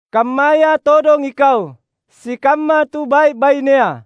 Kammaya todong ikau, sikamma tu bai’-bainea,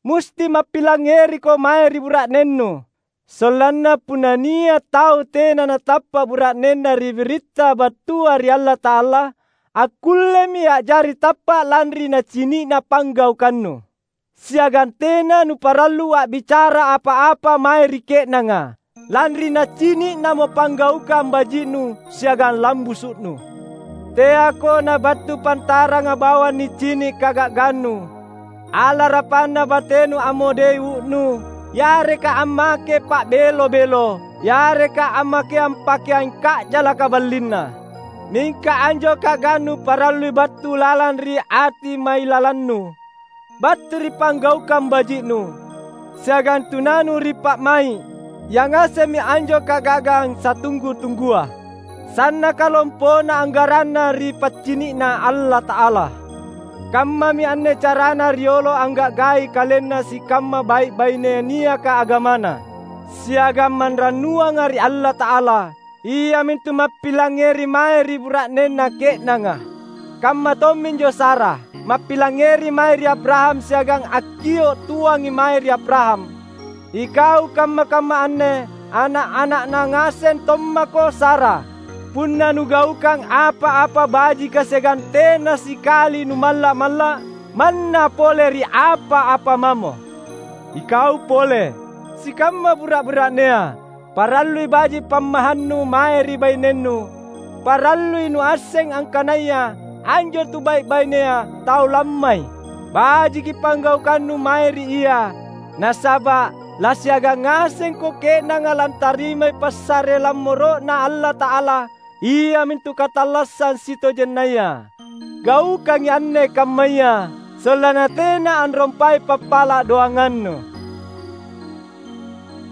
musti mappilangngeriko mae ri bura’nennu. Sollanna punna nia’ tau tena natappa’ bura’nenna ri biritta battua ri Allata’ala, akkullemi a’jari tappa’ lanri nacini’na panggaukannu. Siagang tena nuparallu a’bicara apa-apa mae ri ke’nanga, lanri nacini’namo panggaukang baji’nu siagang lambusu’nu. Teako nabattu pantaranga bawang nicini’ kaga’gannu, alarapanna batenu ammodei uu’nu, yareka ammake pa’belo-belo, yareka ammakeang pakeang ka’jalaka ballinna. Mingka, anjo kaga’gannu parallui battu lalang ri ati mailalannu, battu ri panggaukang baji’nu, siagang tunanu ri pa’mai’; yangasemmi anjo kaga’gang satunggu-tunggua, sannaka lompona anggaranna ri paccini’Na Allata’ala. Kammami anne carana riolo angga’gai kalenna sikamma bai’-baine niaka agamana siagang manrannuanga ri Allata’ala, iamintu mappilangngeri mae ri bura’nenna ke’nanga. Kamma tomminjo Sara, mappilangngeri mae ri Abraham siagang akkio’ tuangi mae ri Abraham. Ikau kamma-kamma anne ana’-ana’na ngaseng tommaka Sara, punna nugaukang apa-apa bajika siagang tena sikali numalla’-malla’ manna pole ri apa-apa mamo. Ikau pole, sikamma bura’-bura’nea, parallui baji’ pammahannu mae ri bainennu; parallui nuasseng angkanaya anjo tubai’-bainea tau lammai. Bajiki panggaukannu mae ri ia, nasaba’ lasiagang ngasengko ke’nanga lantarimai passare lammoro’Na Allata’ala iamintu katallassang sitojennaya. Gaukangi anne kammaya, sollanna tena anrompai pappala’ doangannu.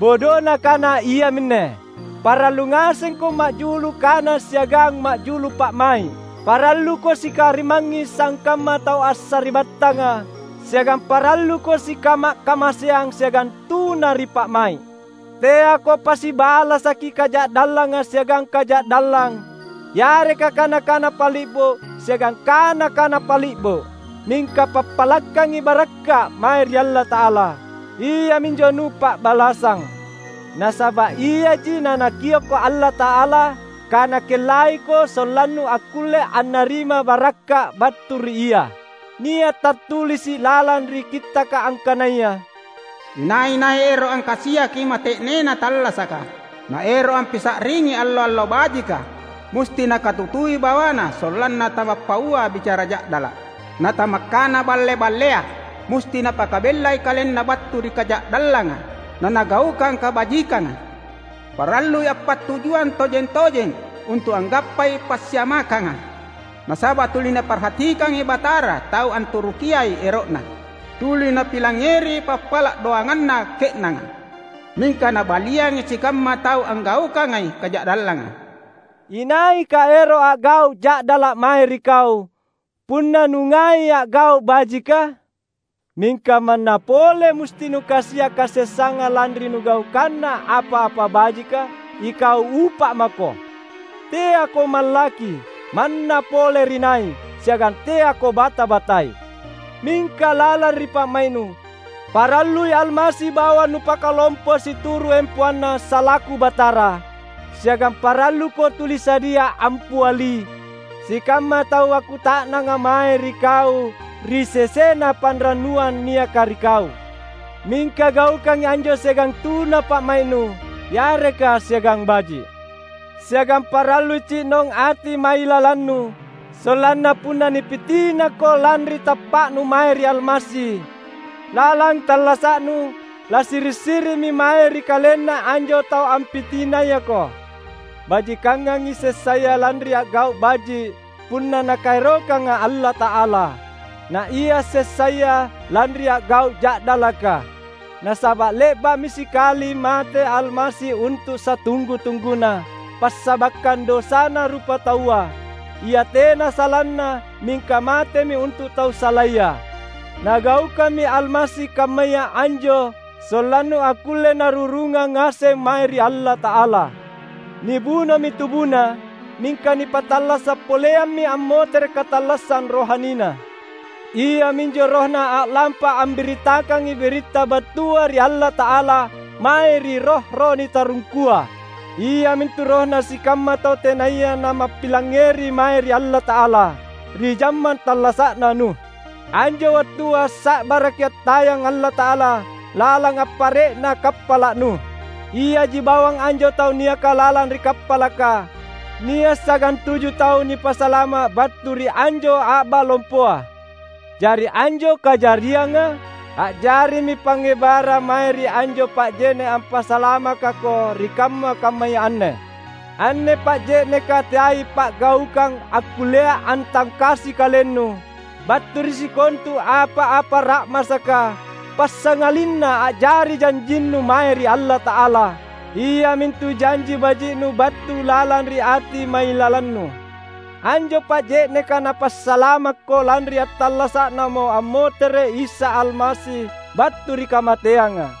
Bodona kana iaminne: parallu ngasengko ma’julu kana siagang majulu pa’mai’. Paralluko sikarimangngi sangkamma tau assari’battanga. Siagang paralluko sikama’-kamaseang siagang tuna ri pa’mai’. Teako pasibalasaki kaja’dallanga siagang kaja’dallang, yareka kana-kana pali’bo siagang kana-kana pali’bo; mingka pappalakkangi barakka’ mae ri Allata’ala; iaminjo nupa’balassang. Nasaba’ iaji naNakiokko Allata’ala kaNakellaiko sollannu akkulle annarima barakka’ battu ri Ia. Nia’ tattulisi’ lalang ri Kittaka angkanaya, "Inai-nai ero’ angkasiaki mate’nena tallasaka, naero’ ampisa’ringi allo-allo bajika, musti nakatutui bawana sollanna tamappaua bicara ja’dala’, natamakkana balle-ballea. Musti napakabellai kalenna battu ri kaja’dallanga nanagaukang kabajikanga; parallui appattujuang tojeng-tojeng untu’ anggappai passiamakkanga. Nasaba’ tuli Naparhatikangi Batara tau anturukiai ero’Na, tuli Napilangngeri pappala’ doanganna ke’nanga; mingka Nabaliangi sikamma tau anggaukangai kaja’dallanga." Inaika ero’ a’gau’ ja’dala’ mae ri kau, punna nungai a’gau’ bajika? Mingka manna pole musti nukasia’ kasessanga lanri nugaukanna apa-apa bajika, ikau upa’ mako! Teako mallakki manna pole ri nai, siagang teako bata-batai. Mingka lalang ri pa’mai’nu, parallui Almasi bawang nupakalompo situru’ empoanNa salaku Batara. Siagang paralluko tuli sadia ampiali sikamma tau akkuta’nanga mae ri kau ri sesena panrannuang niaka ri kau. Mingka gaukangi anjo siagang tuna pa’mai’nu yareka siagang baji’. Siagang parallui ci’nong ati mailalannu, sollanna punna nipitinako lanri tappa’nu mae ri Almasi lalang tallasa’nu, lasiri’-siri’mi mae ri kalenna anjo tau ampitinayako. Bajikangangi sessaya lanri a’gau’ baji’ — punna Nakaerokang Allata’ala — naia sessaya lanri a’gau’ ja’dalaka. Nasaba’ le’ba’mi sikali mate Almasi untu’ satunggu-tungguna passabakkang dosana rupataua; Ia tena salanna mingka matemi untu’ tau salaya. Nagaukammi Almasi kammaya anjo sollannu akkulle Narurungang ngaseng mae ri Allata’ala. Nibunomi tubuNa, mingka nipattallasa’ poleammi ammotere’ katallassang rohaniNa. Iaminjo RohNa a’lampa ambirittakangi biritta battua ri Allata’ala mae ri roh-roh nitarungkua: iamintu rohna sikamma tau tenaya namappilangngeri mae ri Allata’ala ri jammang tallasa’na Nuh. Anjo wattua sa’baraki attayang Allata’ala lalang appare’na kappala’ Nuh. Iaji bawang anjo tau niaka lalang ri kappalaka — nia’ sagantuju tau — nipasalama’ battu ri anjo a’ba lompoa. Jari anjo kajarianga a’jarimi pangngebarang mae ri anjo pa’je’ne’ ampasalamakako ri kamma-kammaya anne. Anne pa’je’neka teai pa’gaukang akkullea antangkasi kalennu battu ri sikontu apa-apa ra’masaka, passangalinna a’jari janjinnu mae ri Allata’ala, iamintu janji baji’nu battu lalang ri ati mailalannu. Anjo pa’je’neka napasalamakko lanri attallasa’Namo ammotere’ Isa Almasi battu ri kamateanga,